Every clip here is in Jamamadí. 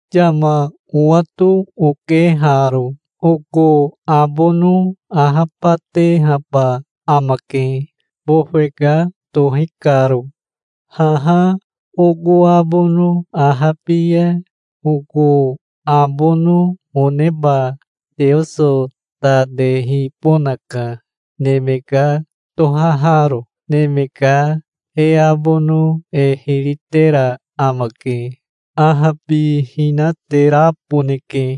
Yama owato oke haro. Oko abono ahabatehaba amake, bofe ka tohi karo. Haha oko abono ahabi ya oko abono oneba Teoso ta tehibonaka, neme ka tohaharo. Neme ka e abono e hiri tera amake. Ahabihinateraboneke.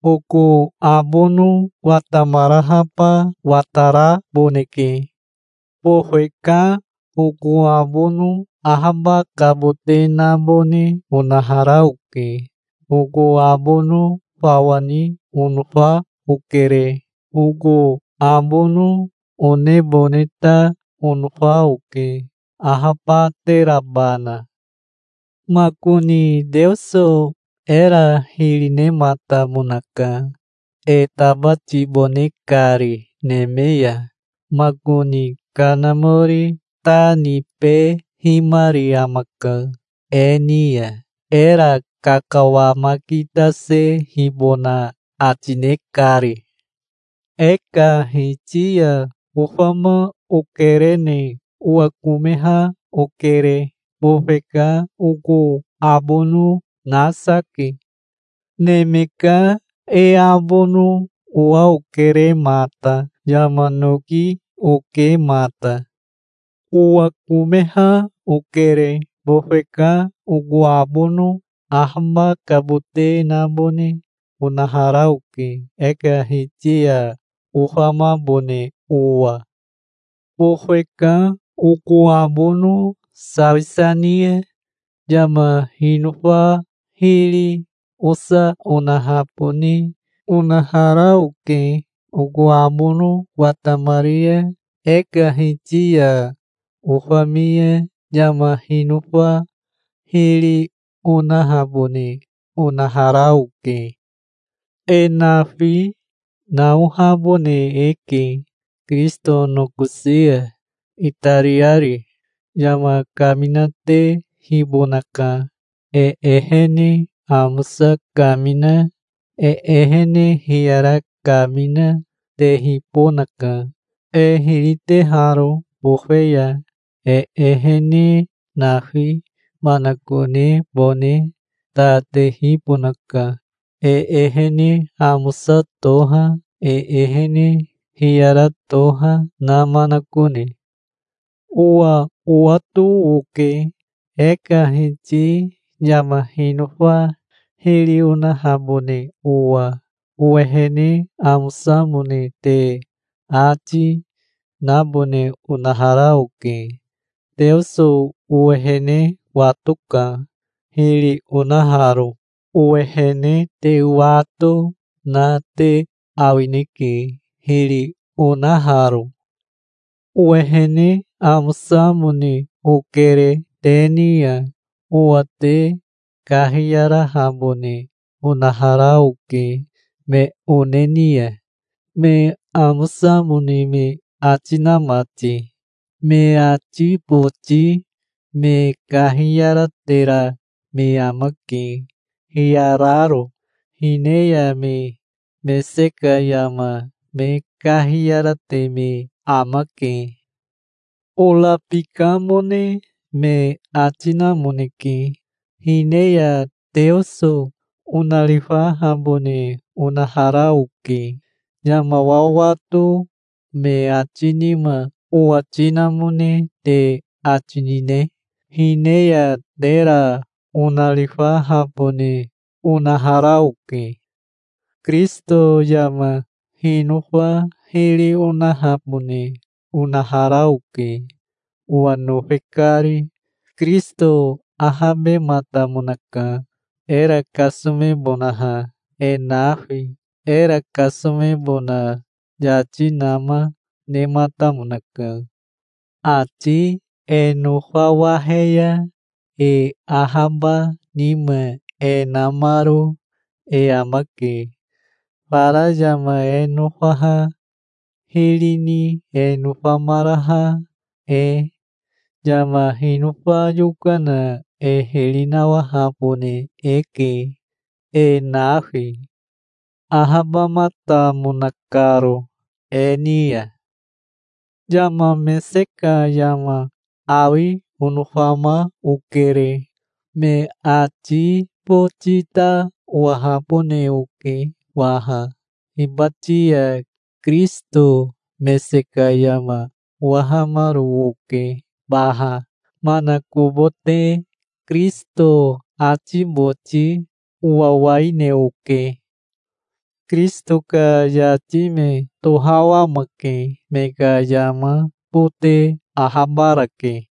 Oko abono watamarahaba wataraboneke. Bofe ka oko abono ahabakabote nabone onahara oke. Oko abono fawa ni onofa okere. Oko abono onebone ta onofa oke, ahabaterabana. Makoni Teoso era hiri nematamonaka, e tabatibone kari neme ya. Makoni Kanamori ta nibehimari amaka e ni ya, era kakawamakitasehibona ati ne kari. E ka Hiti ya ofama okerene owakomeha okere. Bofe ka oko abono nasa ke. Neme ka e abono owa okere mata. Yama noki oke mata. Owakomeha okere. Bofe ka oko abono ahabakabote nabone onahara oke, e ka Hiti ya ofamabone owa. Bofe ka oko abono sawisa ni ya yama hinofa hiri osa onahabone onahara oke. Oko abono watamari ya e ka Hiti ya ofami ya yama hinofa hiri, onahabone onahara oke. E nafi naohabone eke Kirisito nokosi ya, itariari. Yama kaminatehibonaka. E ehene amosa kamina, e ehene hiyara kamina, tehibonaka, e hiri teharo bofe ya. E ehene nafi manakonebone ta tehibonaka, e ehene amosa toha, e ehene hiyara toha na manakone. Owa owato oke, e ka Hiti yama hinofa hiri onahabone owa. Owehene amosamone te ati, nabone onahara oke. Teoso owehene watoka, hiri onaharo. Owehene te wato na te awineke, hiri onaharo. Owehene amosamone okere te ni ya. Owa te kahiyarahabone onahara oke me one ni ya, me amosamone me ati na mati. Me ati boti me kahiyaratera me amake, hiyararo. Hine ya me mese ka yama me kahiyarate me amake. Orabikamone me ati namoneke. Hine ya Teoso onarifahabone onahara oke. Yama wawato me ati nima owati namone te ati nine? Hine ya tera onarifahabone onahara oke. Kirisito yama hinofa hiri onahabone onahara oke, owa nofe kari. Kirisito ahabematamonaka, era kasomebonaha, e nafi. Era kasomebona yati nama nematamonaka. Ati e nofawahe ya e ahaba nima e namaro e amake, fara yama e nofaha hiri ni e nofamaraha e. Yama hinofa yokana e hiri nawahabone eke e nafi, ahabamatamona karo e ni ya. Yama mese ka yama awi onofama okere. Me ati boti ta owahabone oke waha. Hibati ya Kirisito mese ka yama owahamaro oke baha. Manakobote Kirisito ati boti owawaine oke. Kirisito ka yati me tohawamake. Me ka yama bote ahabarake.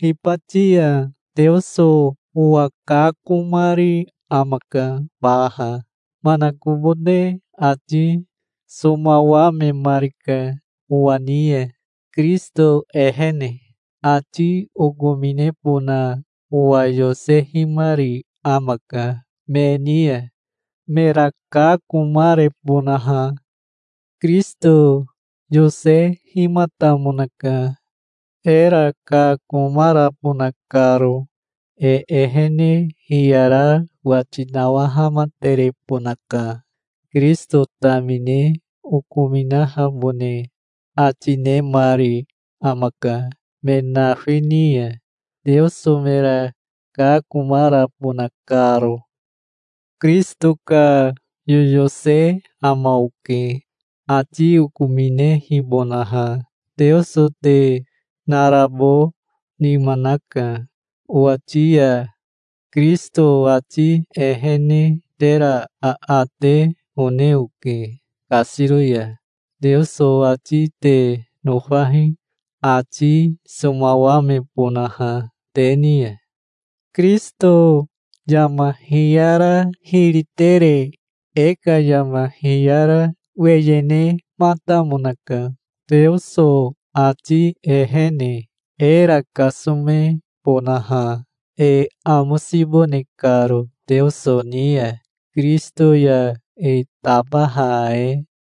Hibati ya Teoso owa kakomari amaka baha. Manakobote ati somawamemarika owa ni ya, Kirisito ehene. Ati okominebona owa yosehimari amaka me ni ya, mera kakomarebonaha. Kirisito yosehimatamonaka, era kakomarabona karo. E ehene hiyara wati nawahamaterebonaka. Kirisito tamine okominahabone ati nemari amaka me nafi ni ya, Teoso mera kakomarabona karo. Kirisito ka yoyose ama oke, ati okominehibonaha. Teoso te narabo nima naka owati ya. Kirisito ati ehene tera aate one oke kasiro ya. Teoso ati te nofahi, ati somawamebonaha te ni ya. Kirisito yama hiyara hiri tere e ka yama hiyara weye nematamonaka Teoso ati ehene, era kasomebonaha, e amosibone karo Teoso ni ya, Kirisito ya e tabaha e.